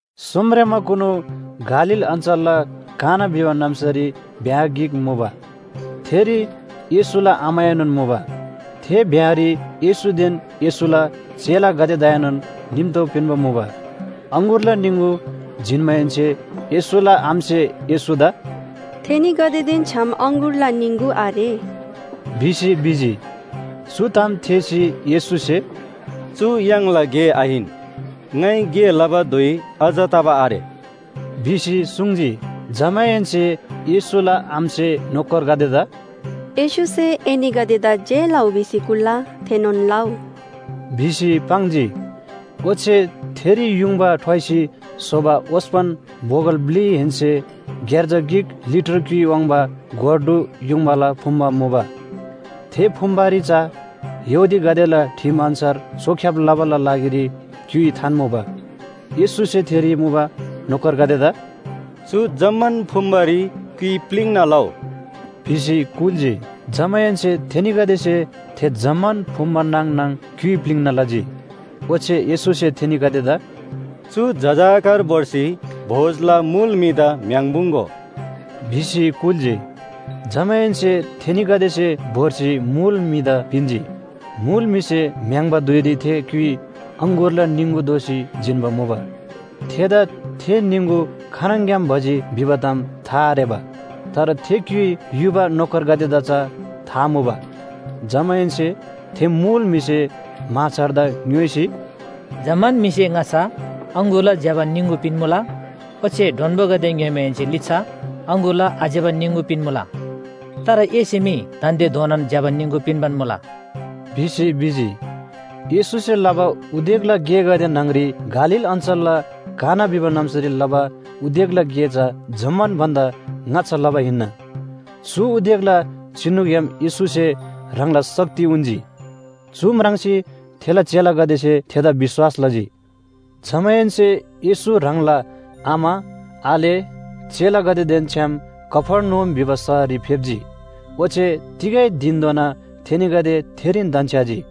सोमरेमाकुनु गालील अञ्‍चलला काना भिबा नाम्‍सारी ब्‍याह गिक मुबा। थेरी येशूला आमाएनोन मुबा। थे ब्‍याहरी येशूदेन येशूला चेलागदेदाएनोन निम्‍तो पिन्‍बा मुबा। अङगुरला निङगु जिन्‍माहेन्‍से येशूला आमासे येशूदा “थेनीगदेदेन छ्‌याम अङगुरला निङगु आरे” भिसी भिजी। चु ताम थेःसी येशूसे “चु य्‍हाङला गे आहिन। ङाइ गे लबा धुइ अझ तबा आरे” भिसी सुङ्जी। जमाहेन्‍से येशूला आमासे नोकरगदेदा “येशूसे एनीगदेदा जे लउ भिसी कुल्‍ला, थेनोन लउ” भिसी पाङ्जी। ओच्‍छे थेरी युङबा ठ्वाइसी स्‍होबा ओस्‍पन बोगल ब्‍लिहेन्‍से ग्‍यार्जा गिक लिटर क्‍युइ वाङ्बा गोर ढु युङबाला फुम्‍बा मुबा। थे फुम्‍बारी चा यहूदीगदेला ठिम अन्‍छार चोख्‍याब लबाला लागिरी क्‍युइ थान्‍मुबा। येशूसे थेरी मुबा नोकरगदेदा “चु जम्‍मान फुम्‍बारी क्‍युइ प्‍लिङ्‍ना लउ” भिसी कुल्‍जी। जमाहेन्‍से थेनीगदेसे थे जम्‍मान फुम्‍बा नाङ नाङ क्‍युइ प्‍लिङ्‍ना लजी। ओच्‍छे येशूसे थेनीगदेदा “चु जजाकर भोर्सी भोजला मुल म्‍हिदा म्‍य्‍हाङ्पुङ्‍गो” भिसी कुल्‍जी। जमाहेन्‍से थेनीगदेसे भोर्सी मुल म्‍हिदा पिन्‍जी। मुल म्‍हिसे म्‍य्‍हाङ्बा धुइरी थे क्‍युइ अङगुरला निङगु दोसी जिन्‍बा मुबा। थेदा थे निङगु खानङग्‍याम भजी भिबा ताम था आरेबा, तर थे क्‍युइ युबा नोकरगदेदा चा था मुबा। जमाहेन्‍से थे मुल म्‍हिसे म्‍हाछारदा ङ्‌योइसी, “जम्‍मान म्‍हिसे ङाच्‍छा अङगुरला ज्‍यबा निङगु पिन्‍मुला। ओच्‍छे डोन्‍बोगदे ङ्‍योइमाहेन्‍से लिच्‍छा अङगुरला आज्‍यबा निङगु पिन्‍मुला। तर एसे मी दान्‍दे धोनान ज्‍यबा निङगु पिन्‍बान मुला” भिसी भिजी। येशूसे लबा उदेकला गेगदे न्‍हङ‍री गालील अञ्‍चलला काना भिबा नाम्‍सारी लबा उदेकला गे चा जम्‍मान भन्‍दा ङाच्‍छा लबा हिन्‍ना। चु उदेकला चिनुग्‍याम येशूसे ह्राङला शक्ति उन्‍जी। चु म्राङ्सी थेला चेलागदेसे थेदा विश्‍वास लजी। जमाहेन्‍से येशू ह्राङला आमा, आले, चेलागदेदेन छ्‌याम कफर्नहुम भिबा शहररी फेप्‍जी। ओच्‍छे तिगै धिनधोना थेनीगदे थेरीन धन्‍छ्‌याजी।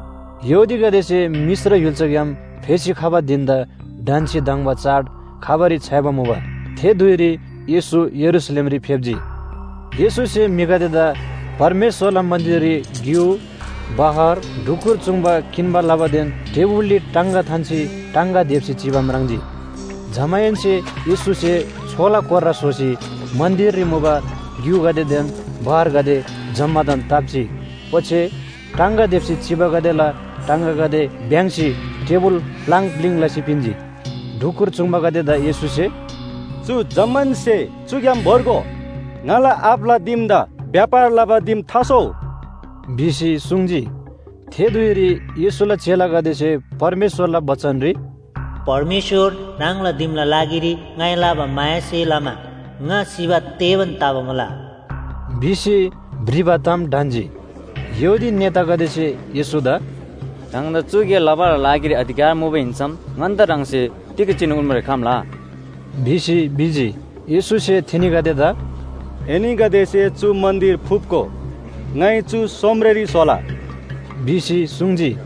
यहूदीगदेसे मिश्र य्‍हुल्‍साग्‍याम फेसी खबा धिन‍दा ढन्‍सी धङ्बा चाड खबारी छ्‌याइबा मुबा। थे धुइरी येशू यरूशलेमरी फेप्‍जी। येशूसे म्‍हिगदेदा परमेश्‍वरला मन्‍दिररी ग्‍यु, बहर, ढुकुर चूङ्बा किन्‍बा लबादेन टेबुलरी टाङगा थान्‍सी टाङगा देप्‍सी चिबा म्राङ्जी। जमाहेन्‍से येशूसे छोला कोर्रा स्‍होसी मन्‍दिररी मुबा ग्‍युगदेदेन बहरगदे जम्‍मादान ताप्‍जी, ओच्‍छे टाङगा देप्‍सी चिबागदेला टाङगागदे भ्‍याङ्‍सी टेबुल प्‍लाङ प्‍लिङ लसी पिन्‍जी। ढुकुर चूङ्बागदेदा येशूसे “चु जम्‍मान स्‍हे चुग्‍याम भोर्गो। ङाला आबाला दिमदा व्‍यापार लबा दिम थास्‍होउ” भिसी सुङ्जी। थे धुइरी येशूला चेलागदेसे परमेश्‍वरला बचनरी, “परमेश्‍वर! ह्राङला दिमला लागिरी ङाइ लबा मायासे लमा ङा सिबा तेबान तबा मुला” भिसी भ्रिबा ताम ढन्‍जी। यहूदी नेतागदेसे येशूदा “ह्राङदा चु गे लबाला लागिरी अधिकार मुबा हिन्‍सम ङन्‍दा ह्राङसे तिग चिनु उन्‍बारी खम्‍ला?” भिसी भिजी। येशूसे थेनीगदेदा “एनीगदेसे चु मन्‍दिर फुप्‍गो, ङाइ चु सोमरेरी स्‍होला” भिसी सुङ्जी।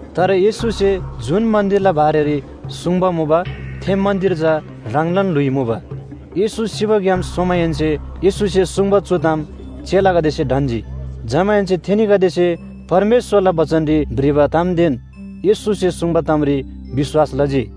तर येशूसे जुन मन्‍दिरला बारेरी सुङ्बा मुबा, थे मन्‍दिर चा ह्राङलान ल्‍हुइ मुबा। येशू सिबाग्‍याम सोमाहेन्‍से येशूसे सुङ्बा चु ताम चेलागदेसे ढन्‍जी। जमाहेन्‍से थेनीगदेसे परमेश्‍वरला बचनरी भ्रिबा तामदेन येशूसे सुङ्बा तामरी विश्‍वास लजी।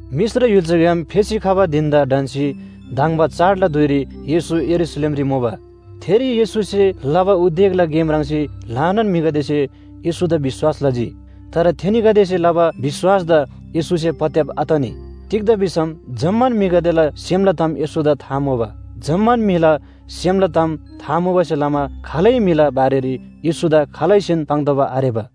मिश्र य्‍हुल्‍साग्‍याम फेसी खबा धिन‍दा ढन्‍सी धङ्बा चाडला धुइरी येशू यरूशलेमरी मुबा। थेरी येशूसे लबा उदेकला गे म्राङ्सी ल्‍हानान म्‍हिगदेसे येशूदा विश्‍वास लजी। तर थेनीगदेसे लबा विश्‍वासदा येशूसे पत्‍याब आतनी। तिग्‍दा भिसम जम्‍मान म्‍हिगदेला सेमला ताम येशूदा था मुबा। जम्‍मान म्‍हिला सेमला ताम था मुबासे लमा खालै म्‍हिला बारेरी येशूदा खालैसेन पाङ्तोःबा आरेबा।